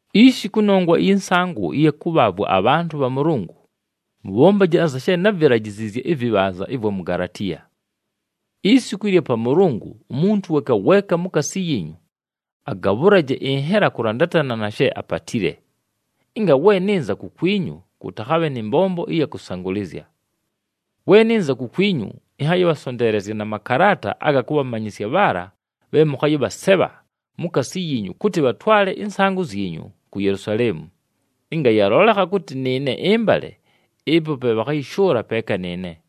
Ishi, kʉnongwa ɨyɨ nsaangʉ ɨya kʉbhaavwa abhantʉ bha Mʉlʉngʉ, mʉbhombaje anza she návilajiziizye ɨvɨbhanza ɨvwa mu Galatiya. Isiku ɨlya Pamʉlʉngʉ, umuntu weeka weeka mukaasi yiinyu agabhʉlaje ɨnhela kʉlandatana na she apatile, ɨnga we nɨnza kukwinyu, kʉtakhabhe nɨ mbombo ɨya kʉsangʉlɨzya. We nɨnza kukwinyu, ɨnhayɨbhasonteelezya na makalaata aga kʉbhamanyɨsya bhaala bhe mʉkhayɨbhasebha mukaasi yiinyu kʉtɨ bhatwale ɨnsaangʉ zyinyu ku Yelusaleemu. Ɨnga yalolekha kʉtɨ nɨɨne ɨmbale, ɨpo pe bhakhayɨshʉʉla peeka nɨɨne.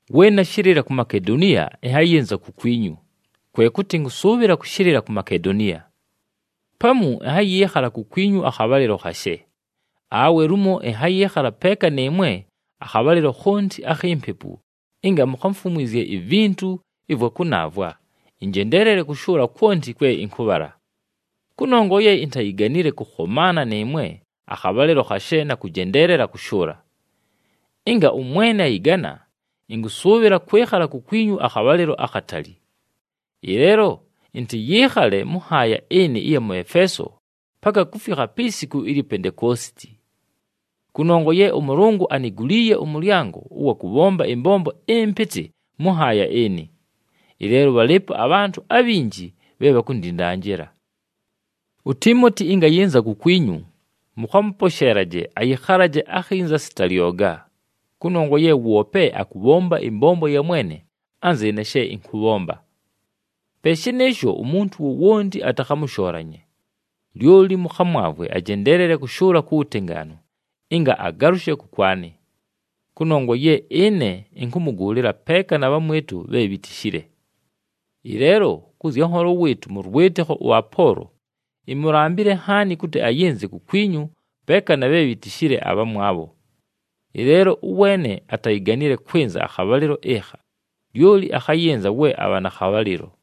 We nashɨlɨla ku Makedoniya, ɨnhayɨnza kukwinyu, kwe kʉtɨ ɨnkʉsʉʉbhɨla kʉshɨlɨla ku Makedoniya. Pamu ɨnhayɨɨkhala kukwinyu akhabhalɨlo khashe, awe lumo ɨnhayɨɨkhala peeka nɨɨmwe akhabhalɨlo khonti akhi mpepu ɨnga mukhamfumwizye ivintu ɨvwa kʉnaavwa, ɨnjendeelele kʉshʉʉla kwonti kwe ɨnkʉbhala. Kʉnongwa ye intayiganile kʉkhomaana nɨɨmwe akhabhalɨlo khashe na kʉjendeelela kʉshʉʉla. Ɨnga ʉMwene ayɨgana, ɨnkʉsʉʉbhɨla kwɨkhala kukwinyu akhabhalɨlo akhatali. Ɨleelo ɨntɨyɨɨkhale mʉ nhaaya ɨnɨ ɨya mʉ Efeeso paka kufikha pi siku ilyi Pentekoositi. Kʉnongwa ye ʉMʉlʉngʉ aniguliiye ʉmʉlyango ʉwa kʉbhomba ɨmbombo ɨmpɨtɨ mʉ nhaaya ɨnɨ, ɨleelo bhalɨɨpo abhantʉ abhinji bhe bhakundindanjila. UTiimoti ɨnga ayɨnza kukwinyu, mʉkhamʉposheelaje ayɨkhalaje akhinza sita lyoga, kʉnongwa ye woope akʉbhomba ɨmbombo ya Mwene anzɨɨne she ɨnkʉbhomba. Pe shɨnɨɨsho, umuntu wowonti atakhamʉshoolanye. Lyoli mʉkhamwavwe ajendeelele kʉshʉʉla ku wutengaanu, ɨnga agalʉshe kʉkwanɨ. Kʉnongwa ye ɨne ɨnkʉmʉgʉʉlɨla peeka na bhamwɨtʉ bhe bhitishile. Ɨleelo kʉ zya nholo wɨɨtʉ mʉ lwɨtɨkho ʉApoolo, imulambile nhaani kʉtɨ ayɨnze kukwinyu peeka na bhe bhitishile abhamwabho. Ɨleelo ʉweene atayiganile kwɨnza akhabhalɨlo ɨkha, lyoli akhayɨnza we abha na khabhalɨlo.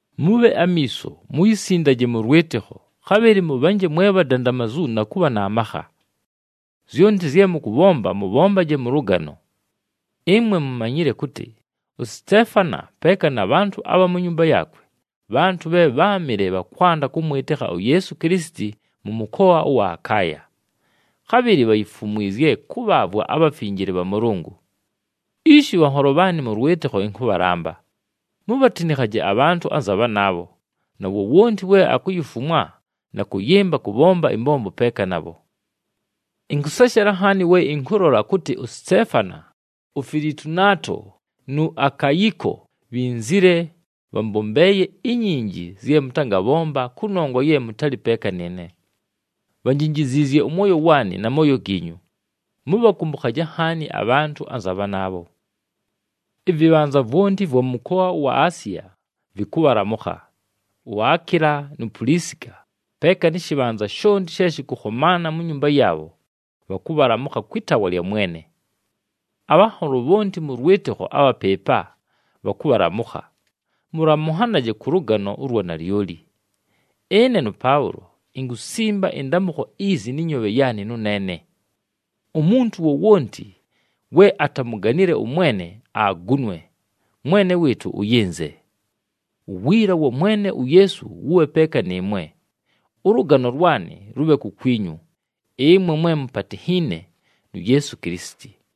Mʉbhe amiiso, muyisindaje mʉ lwɨtɨkho, khabhɨlɨ mʉbhanje mwe bhadandamazu na kʉbha na makha. Zyonti zye mʉkʉbhomba, mʉbhombaje mʉ lʉgano. Ɨmwe mumanyile kʉtɨ uSiteefana peeka na bhantʉ abha mu nyumba yaakwe, bhantʉ bhe bháamɨle bha kwanda kʉmwɨtɨkha uYeesu Kilisiti mʉ mʉkoa ʉwa Akaaya. Khabhɨlɨ bhayifumwizye kʉbhaavwa abhafinjile bha Mʉlʉngʉ. Ishi bhanholo bhaanɨ mʉ lwɨtɨkho ɨnkʉbhalamba, mubhatinikhaje abhantʉ anza bhanaabho, na wowonti we akuyifumwa na kʉyɨmba kʉbhomba ɨmbombo peeka nabho. Ɨnkʉseshela nhaani we ɨnkʉlola kʉtɨ uSiteefana, uFilitunaato, nu Akayiko, bhinzile, bhambombeeye inyinji zye mʉtangabhomba kʉnongwa ye mʉtalɨ peeka nɨɨne. Bhanjinjiziizye ʉmwoyo waanɨ, na mooyo giinyu. Mʉbhakʉmbʉkhaje nhaani abhantʉ anza bhanaabho. Ɨvɨbhanza vwonti ɨvwa mʉ mʉkoa ʉwa Asiya vɨkʉbhalamʉkha. UAkiila nu Pulisika, peeka nɨ shɨbhanza shonti she shɨkʉkhomaana mu nyumba yaabho, bhakʉbhalamʉkha kwɨ taawa lya Mwene. Abhanholo bhonti mʉ lwɨtɨkho abha pɨɨpa, bhakʉbhalamʉkha. Mʉlamʉnhanaje kʉ lʉgano ʉlwa nalyoli. Ɨne nʉPaʉlo, inkusimba ɨndamʉkho izi nɨ nyoobhe yaanɨ nʉneene. Umuntu wowonti we atamuganile ʉMwene, agunwe. Mwene wɨɨtʉ ʉyɨnze! Uwiila wa Mwene uYeesu wʉbhe peeka nɨɨmwe. Ʉlʉgano lwanɨ lʉbhe kukwinyu, ɨmwe mwe mupatinhiine nu Yeesu Kilisiti.